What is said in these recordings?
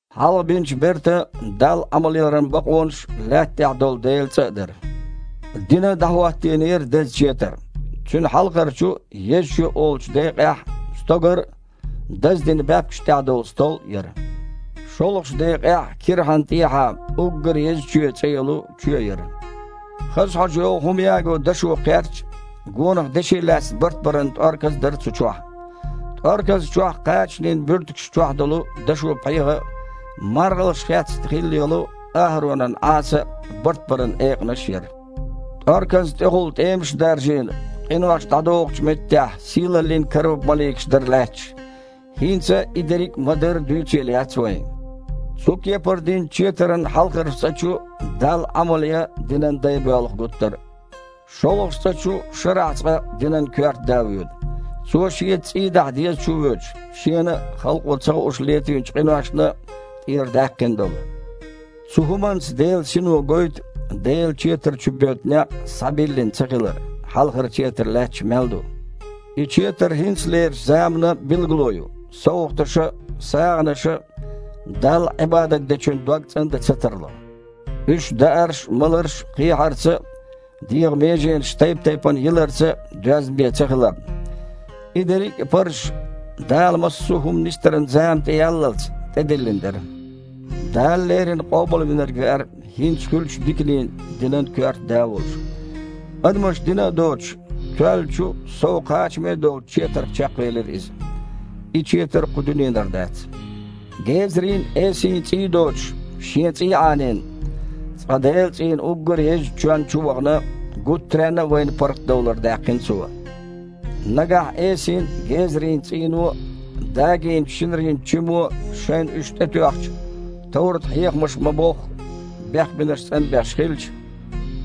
Хьалха бинчу бертан Далла Іамалъяран бакъонаш а, лаьтта тІехь долу Делан цІа а дара. Дина, дІахІоттийнера деза четар. Цуьнан хьалхарчу, «еза чоь» олучу декъехь стогар а, даздина баьпкаш тІехь долу стол а яра. ШолгІачу декъехь кирхьанна тІехьа «уггар еза чоь» цІе йолу чоь яра. Хаза хьожа йогІу хІума яго дашо кхерч а, гонах деши лаьцна бартбаран тІорказ а дара цу чохь. ТІорказна чохь кхачанийн буьртигаш чохь долу дашо пхьегІа а, маргІалш хецна хилла йолу АхІаронан Іаса а, бартбаран экъанаш а яра. ТІорказна тІехула тІемаш а даржийна, къинош дІадохучу меттехь сийлаллин каруб-маликаш дара лаьтташ. ХІинца и дерриг а ма-дарра дуьйцийла яц вайн. Цу кепара динчу четаран хьалхарчу цІа чу Далла Іамал ян динан дай боьлху гуттар а. ШолгІачу цІа чу шарахь цкъа динан коьрта да воьду. Цо шеца цІий дахьа деза чувоьдуш, шена а, халкъо ца хууш летийначу къиношна а тІера даьккхина долу. Цу хІуманца Делан Сино гойту Делан четар чу боьду некъ схьабиллина цахилар, хьалхара четар лаьтташ мел ду. И четар хІинцалерчу заманан билгало ю: совгІаташа а, сагІанаша а Далла Іибадат дечун дог цІандан ца тарло, уьш даарш а, маларш а кхехьарца а, дегІан меженаш тайп-тайпана йиларца а доьзна бен цахиларна. И дерриг а парзаш, Дала массо а хІума нисдаран зама тІеяллалц, тІедиллина дара. Дала леррина Къобалвинарг веара, хІинца хуьлучу диканийн динан коьрта да а волуш. Адамаша дина а доцуш, тоьллачу а, сов кхачаме а долчу четарх чекхвелира Иза (и четар кху дуьненара дац). Гезарийн а, эсийн а цІий доцуш, Шен цІий а Іанийна, цкъа Делан цІийнан уггар езачу чоьнна чу а вахана, гуттаренна а вайна паргІатдовлар даьккхина Цо. Нагахь эсийн а, гезарийн а цІийно а, дагийначу шинарин чимо а, шайна уьш тІетоьхча, товрат-хьехамаша ма-бохху, бехбинарш цІанбеш хилча,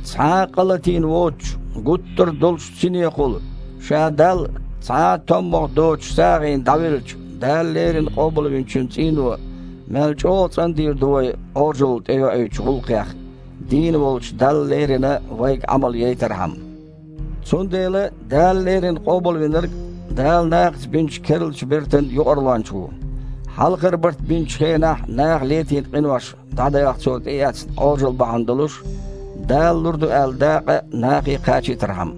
цхьа а къа латийна воцучу, гуттар а долуш долчу Синехула Ша Далла цхьа а томмагІа доцучу сагІина дІавеллачу Дала леррина Къобалвинчун цІийно мел чІогІа цІандийр ду вай Іожалла тІейоуьйтучу гІуллакхех, дийна волчу Далла лерина вайга Іамал яйтархьама. Цундела Дала леррина Къобалвинарг Дала нахаца бинчу керлачу бертан Юкъарлонча ву, хьалхара барт бинчу хенахь наха летийна къинош дІадаха Цо тІеэцна Іожалла бахьана долуш, Дала лур ду аьлла дакъа нахе кхачийтархьама.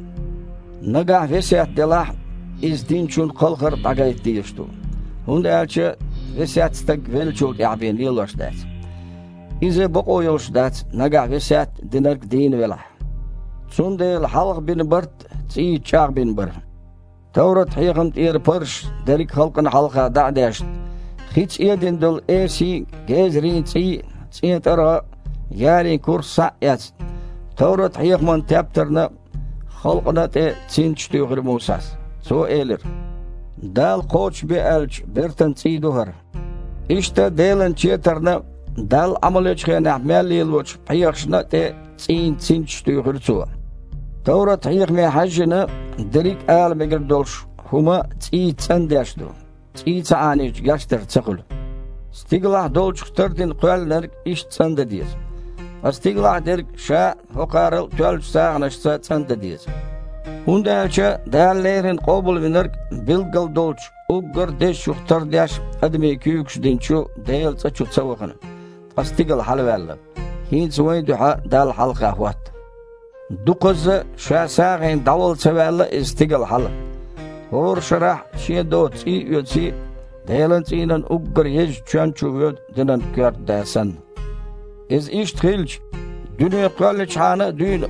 Нагахь весет делахь, иза диначун кхалхар а дІагайта дезаш ду, хІунда аьлча весет стаг веллачул тІаьхьа бен лелош дац. Иза бакъо йолуш дац, нагахь весет динарг дийна велахь. Цундела хьалха бина барт а цІийца чІагІбина бара. Товрат-хьехам тІера парзаш дерриг а халкъана хьалха дІа а дешна, хица эдина долу эсийн а, гезарийн а цІий а, цІен тІаргІа а, ярийн курс а, схьа а эцна, товрат-хьехаман тептарна а, халкъана а тІе цинцаш туьйхира Мусас. Цо элира: «Дала кхочушбе аьллачу бертан цІий ду хІара». Иштта Делан четарна а, Далла Іамал ечу хенахь мел лелочу пхьегІашна а тІе цІийн цинцаш туьйхира цо. Товрат-хьехаме хьаьжжина, дерриг а ала мегар долуш хІума цІийца цІандеш ду, цІий ца Іанийча, гечдар ца хуьлу. Стигалахь долчух тардина кхоьллинарг иштта цІандан деза. Ткъа стигалахь дерг ша а хІокхарал а тоьллачу сагІанашца цІандан деза. ХІунда аьлча Дала леррина Къобалвинарг билггала долчу уггар а Дезачух тардеш адамийн куьйгаша динчу Делан цІа чу ца вахана, ткъа стигала хьалаваьлла, хІинца вайн дуьхьа Далла хьалха хІотта. Дукхазза а Ша сагІина дІавала ца ваьлла Иза стигала хьала, хІора шарахь а шен доцу цІий а оьций, Делан цІийнан уггар езачу чоьнна чу воьду динан коьрта да санна. Иза иштта хилча, дуьне кхоьлличхьана а дуьйна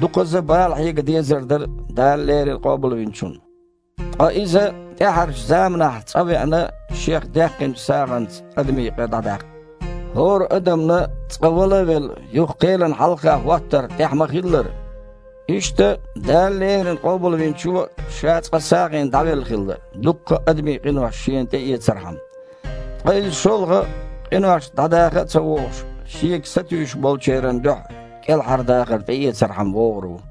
дукхазза а бала хьега дезар дара Дала леррина Къобалвинчун. Ткъа Иза тІаьхьарчу заманахь цкъа веана Шех даьккхинчу сагІанца адамийн къа дІадаккха. ХІора адамна, цкъа вала а велла, юха кхелана хьалха хІоттар тІехь ма-хиллара, иштта Дала леррина Къобалвинчо а Ша цкъа сагІина дІавелла хилла, дуккха а адамийн къинош Шена тІеэцархьама. Ткъа Иза шолгІа, къинош дІадаха а ца вогІуш, Шега сатуьйсуш болчеран дуьхьа кІелхьардахар тІеэцархьама вогІур ву.